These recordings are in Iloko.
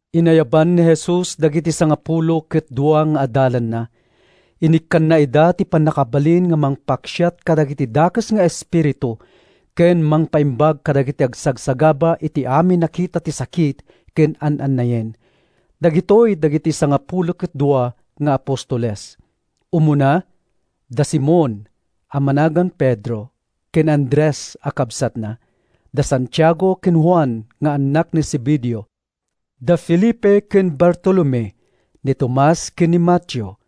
Inayaban ni Jesus dagiti sangapulo ket dua nga adalanna. Inikkanna ida iti pannakabalin a mangpaksiat kadagiti dakes nga espiritu, ken mangpaimbag kadagiti agsagsagaba iti amin a kita ti sakit ken an-annayen. Dagitoy dagiti sangapulo ket dua nga apostoles: umuna, da Simon (a managan Pedro) ken Andres a kabsatna; da Santiago ken Juan nga annak ni Zebedeo; da Felipe ken Bartolome; ni Tomas ken ni Mateo,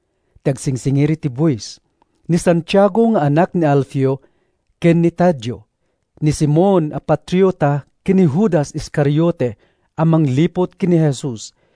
ti agsingsingir iti buis; ni Santiago nga anak ni Alfeo, ken ni Tadeo; ni Simon a Patriota ken ni Judas Iscariote a mangliput ken ni Jesus.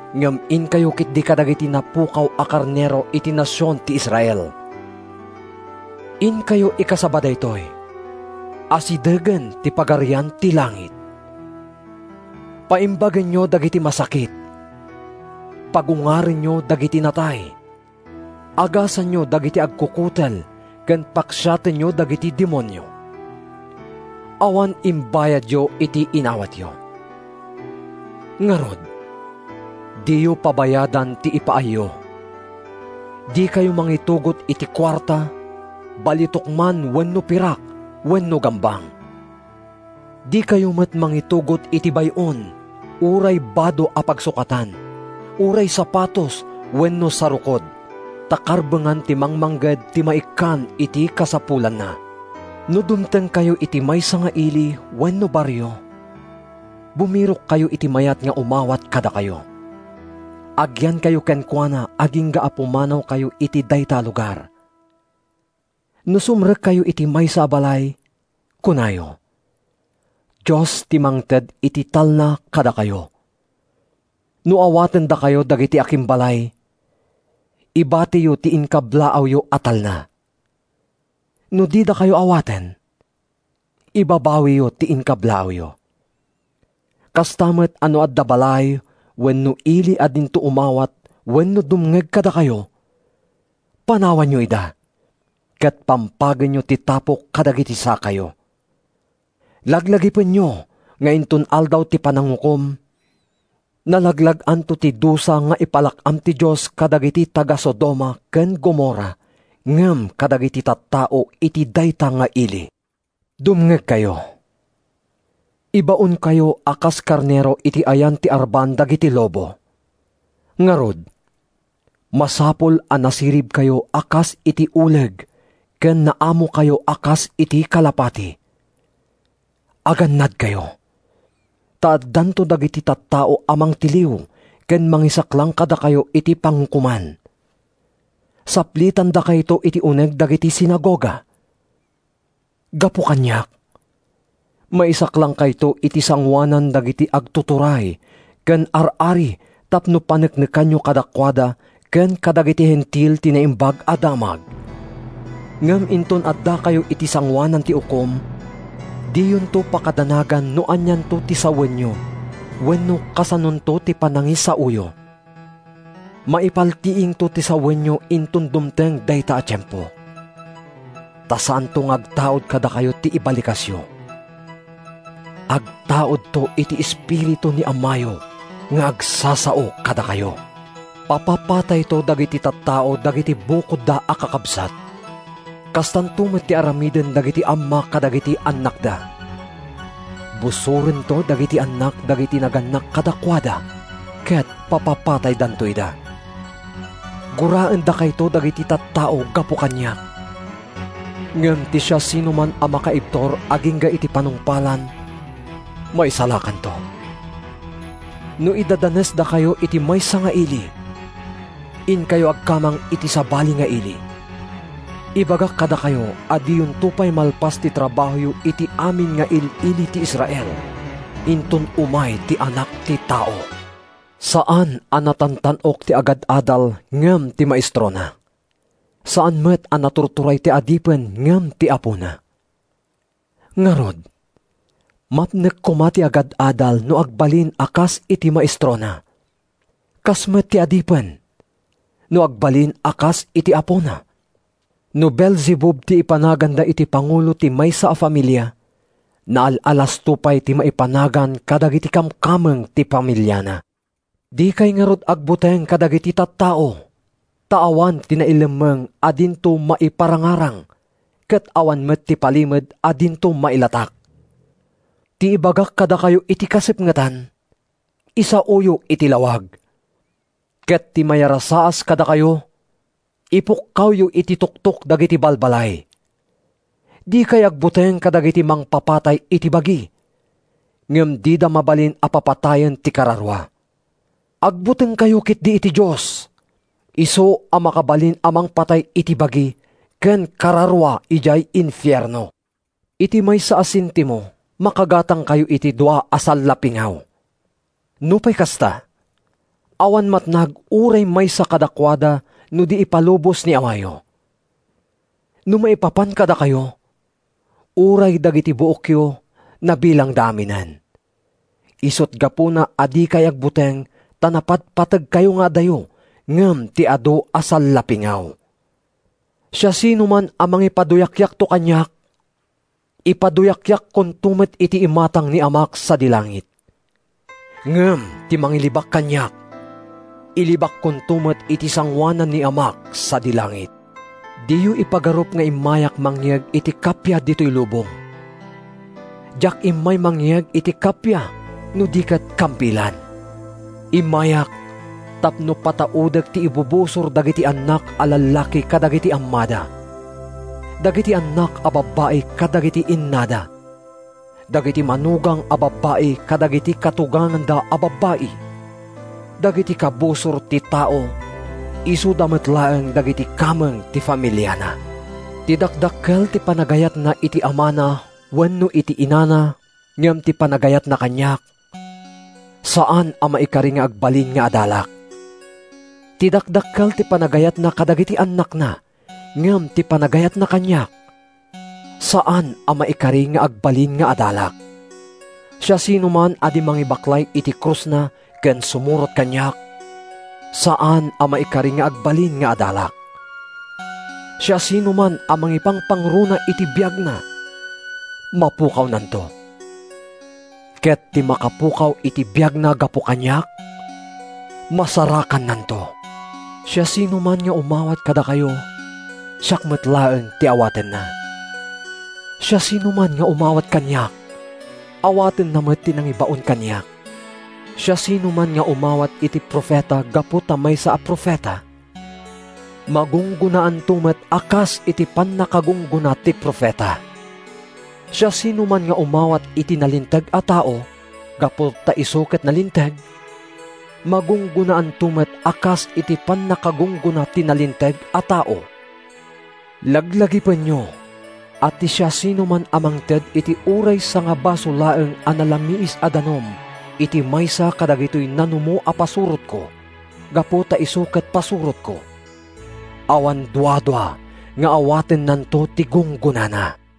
Ngem inkayo ketdi kadagiti napukaw a karnero iti nasion ti Israel. Inkayo ikasaba daytoy, ‘Asidegen ti Pagarian ti Langit!’ Paimbagenyo dagiti masakit, pagungarenyo dagiti natay, agasanyo dagiti agkukutel ken paksiatenyo dagiti demonio. Awan imbayadyo iti inawatyo. Ngarud, diyo pabayadan ti ipaayyo. Dikayo mangitugot iti kuarta—balitok man wenno pirak wenno gambang. Dikayo met mangitugot iti bay-on, uray bado a pagsukatan, uray sapatos wenno sarukod, ta karbengan ti mangmangged ti maikkan iti kasapulanna. “No dumtengkayo iti maysa nga ili wenno barrio, bumirokkayo iti mayat nga umawat kadakayo. Agyankayo kenkuana agingga a pumanawkayo iti dayta a lugar. No sumrekkayo iti maysa a balay, kunayo, ‘Dios ti mangted iti talna kadakayo.’ No awatendakayo dagiti akimbalay, ibatiyo ti inkablaawyo a talna. No didakayo awaten, ibabawiyo ti inkablaawyo. “Kasta met a no adda balay wenno ili a dinto umawat wenno dumngeg kadakayo, panawanyo ida ket pampagenyo ti tapok kadagiti sakayo. “Laglagipenyo nga inton Aldaw ti Panangukom, nalaglag-anto ti dusa nga ipalak-am ti Dios kadagiti taga-Sodoma ken Gomorra ngem kadagiti tattao iti dayta nga ili.” “Dumngegkayo! Ibaonkayo a kas karnero iti ayan ti arban dagiti lobo. Ngarud, masapul a nasiribkayo a kas iti uleg ken naamokayo a kas iti kalapati. Agannadkayo, ta addanto dagiti tattao a mangtiliw ken mangisaklang kadakayo iti pangukoman. Saplitendakayto iti uneg dagiti sinagoga. Gapu kaniak, maisaklangkayto iti sangoanan dagiti agtuturay ken ar-ari tapno paneknekanyo kadakuada ken kadagiti Hentil ti Naimbag a Damag. Ngem inton addakayo iti sangoanan ti ukom, diyonto pakadanagan no anianto ti sawenyo wenno kasanonto ti panangisaoyo. Maipaltiingto ti sawenyo inton dumteng dayta a tiempo. Ta saanto nga agtaud kadakayo ti ibalikasyo; agtaudto iti Espiritu ni Amayo nga agsasao kadakayo. “Papapatayto dagiti tattao dagiti bukodda a kakabsat. Kastanto met ti aramiden dagiti amma kadagiti annakda. Busorento dagiti annak dagiti nagannak kadakuada ket papapataydanto ida. Guraendakayto dagiti tattao gapu kaniak. Ngem ti siasinoman a makaibtur agingga iti panungpalan, maisalakanto. No idadanesdakayo iti maysa nga ili, inkayo agkamang iti sabali nga ili. Ibagak kadakayo a diyonto pay malpas ti trabahoyo iti amin nga il-ili ti Israel, inton umay ti Anak ti Tao. “Saan a natantan-ok ti agad-adal ngem ti maestrona; saan met a naturturay ti adipen ngem ti apona. Ngarud, mapnek koma ti agad-adal no agbalin a kas iti maestrona; kasta met ti adipen, no agbalin a kas iti apona. No Beelzebub ti ipanaganda iti pangulo ti maysa a familia, naal-alasto pay ti maipanagan kadagiti kamkameng ti familiana.” “Dikay ngarud agbuteng kadagiti tattao; ta awan ti nailemmeng a dinto maiparangarang, ket awan met ti palimed a dinto mailatak. Ti ibagak kadakayo iti kasipngetan, isaoyo iti lawag; ket ti mayarasaas kadakayo, ipukkawyo iti tuktok dagiti balbalay. Dikay agbuteng kadagiti mangpapatay iti bagi, ngem dida mabalin a papatayen ti kararua. Agbutengkayo ketdi iti Dios, isu a makabalin a mangpatay iti bagi ken kararua idiay infierno. Iti maysa a sentimo makagatangkayo iti dua a sallapingaw. Nupay kasta, awan matnag uray maysa kadakuada no di ipalubos ni Amayo. No maipapan kadakayo, uray dagiti buokyo nabilangda aminen. Isut’ gapuna a dikay agbuteng ta napatpategkayo nga adayo ngem ti adu a sallapingaw.” “Siasinoman a mangipaduyakyakto kaniak, ipaduyakyakkonto met iti imatang ni Amak sadi langit. Ngem ti mangilibak kaniak, ilibakkonto met iti sangoanan ni Amak sadi langit.” “Diyo ipagarup nga immayak mangyeg iti kappia ditoy lubong. Diak immay mangyeg iti kappia no di ket kampilan. Immayak tapno pataudek ti ibubusor dagiti annak a lallaki kadagiti ammada, dagiti annak a babbai kadagiti innada, dagiti manugang a babbai kadagiti katuganganda a babbai. Dagiti kabusor ti tao isuda met laeng dagiti kameng ti familiana. “Ti dakdakkel ti panagayatna iti amana wenno iti inana ngem ti panagayatna kaniak, saan a maikari nga agbalin nga adalak; ti dakdakkel ti panagayatna kadagiti annakna ngem ti panagayatna kaniak, saan a maikari nga agbalin nga adalak. Siasinoman a di mangibaklay iti krusna ken sumurot kaniak, saan a maikari nga agbalin nga adalak. Siasinoman a mangipangpangruna iti biagna, mapukawnanto; ket ti makapukaw iti biagna gapu kaniak, masarakannanto.” “Siasinoman nga umawat kadakayo, siak met laeng ti awatenna. Siasinoman nga umawat kaniak, awatenna met ti nangibaon kaniak. Siasinoman nga umawat iti profeta gapu ta maysa a profeta, magunggonaanto met a kas iti pannakagunggona ti profeta. Siasinoman nga umawat iti nalinteg a tao, gapu ta isu ket nalinteg, magunggonaanto met a kas iti pannakagunggona ti nalinteg a tao. Laglagipenyo a ti siasinoman a mangted iti uray sangabaso laeng a nalamiis a danum iti maysa kadagitoy nanumo a pasurotko, gapu ta isu ket pasurotko, awan duadua nga awatennanto ti gunggonana.”